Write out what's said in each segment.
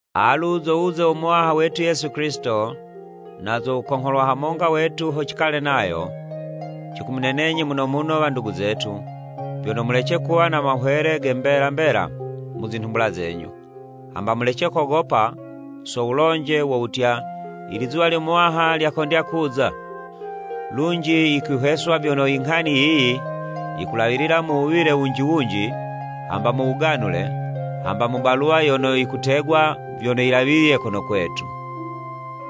Alu zo wuze wo Muwaha wetu Yesu Kilisito, na zo wukongholwa hamonga wetu, ho cikale nayo. Cikumunenenyi muno muno wandugu zetu, vyono mulece kuwa na mahwele ge mbela mbela mu zinhumbula zenyu, hamba mulece kogopa so wulonje wo wutya, “I lizuwa lyo Muwaha lyakondya kuza.” Lunji yikwihweswa vyono i nghani yiyi yikulawilila mu wuwile wunji wunji, hamba mu wuganule, hamba mu baluwa yono yikutegwa vyono yilawiliye kono kwetu.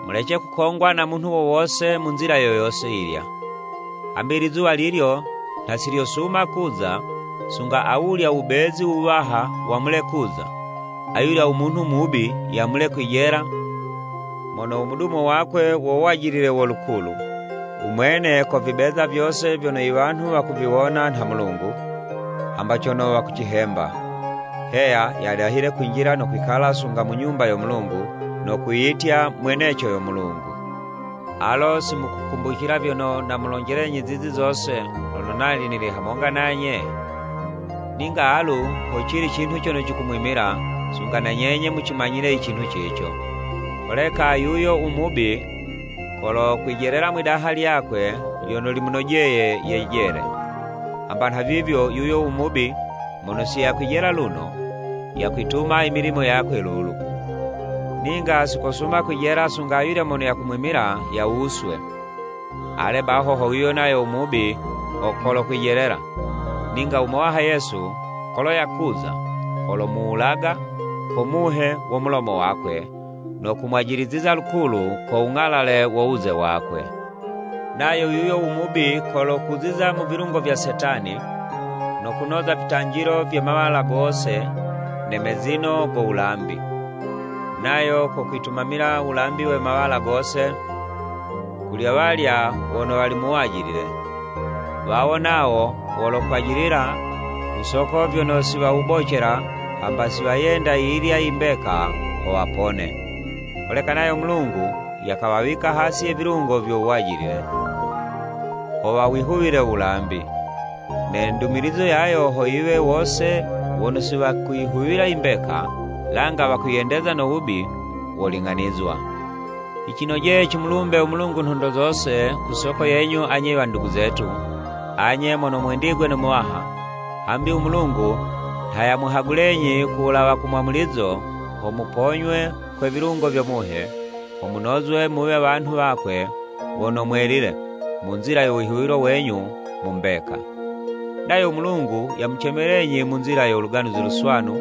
Mulece kukongwa na munhu wo wose mu nzila yo yose yilya. Hambi i lizuwa lilyo nha silyosuma kuza, sunga awulya u Wubezi Wuwaha wamule kuza, ayulya u Munhu mubi yamule kwijela mono u mudumo wakwe wo wajilile wo lukulu. U Mwene kovibeza vyose vyono i wanhu wakuviwona nha Mulungu, hamba cono wakucihemba. Heya, yadahile kwinjila no kwikala sunga mu Nyumba yo Mulungu no kwiyitya mweneco yo Mulungu. Alo si mukukumbucila vyono namulonjelenyi zizi zose lono nali nili hamonga nanye? Ninga alu hocili cinhu cono cikumwimila, sunga na nyenye mucimanyile i cinhu cico. Holeka, yuyo u Mubi kolokwijelela mwi'daha lyakwe lyono limunojeye yejele. Hamba nhavivyo, yuyo u Mubi mono si yakwijela luno, yakwituma i milimo yakwe lulu, ninga si kosuma kwijela sunga ayulya mono yakumwimila yawuswe. Ale baho ho yuyo nayo u Mubi ho kolokwijelela, ninga u Muwaha Yesu kolo yakuza, kolomuwulaga ko muhe wo mulomo wakwe, no kumwajiliziza lukulu ko wung'alale wo wuze wakwe. Nayo yuyo u Mubi, kolokuziza mu vilungo vya Setani, no kunoza vitanjilo vye mawala gose ne mezino go wulambi, nayo kokwitumamila u wulambi we mawala gose kuli awalya wono wali mu wajilile. Wawo nawo wolokwajilila ku soko vyono si wawubocela hamba si wayenda yiyilya i mbeka ho wapone. Holeka nayo u Mulungu yakawawika hasi ye vilungo vyo wajilile, ho wawihuwile u wulambi. Ne ndumilizo yayo ho yiwe, wose wono si wakuyihuwila i mbeka, langa wakwiyendeza no wubi woling'anizwa. Yicinojeye cimulumbe u Mulungu nhondo zose ku soko yenyu anye i wandugu zetu, anye mono mwendigwe no Muwaha, hambi u Mulungu nha yamuhagulenyi ku wulawa ku mwamulizo ho muponywe kwe vilungo vyo Muhe, ho munozwe muwe wanhu wakwe wono mwelile mu nzila yo wihuwilo wenyu mu mbeka. Nayo u Mulungu yamucemelenyi mu nzila yo Luganuzi Luswanu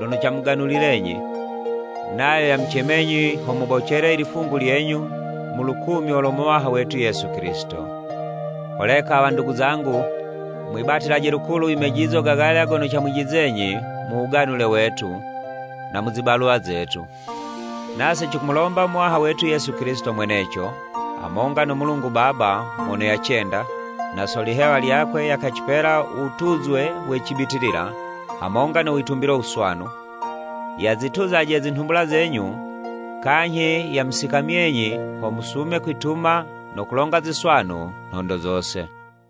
lono camuganulilenyi; nayo yamucemenyi ho mubocele i lifungu lyenyu mu lukumyo lo Muwaha wetu Yesu Kilisito. Holeka wandugu zangu, mwibatilaje lukulu i mejizo gagalya gono camwijizizenyi mu wuganule wetu, na mu zibaluwa zetu. Nase cikumulomba u Muwaha wetu Yesu Kilisito mweneco, hamonga no Mulungu Baba mono yacenda, na so lihewa lyakwe yakacipela u wutuzwe we cibitilila hamonga no witumbilo wuswanu, yazituzaje zinhumbula zenyu kanyhi yamusikamyenyi ho musume kwituma no kulonga ziswanu nhondo zose.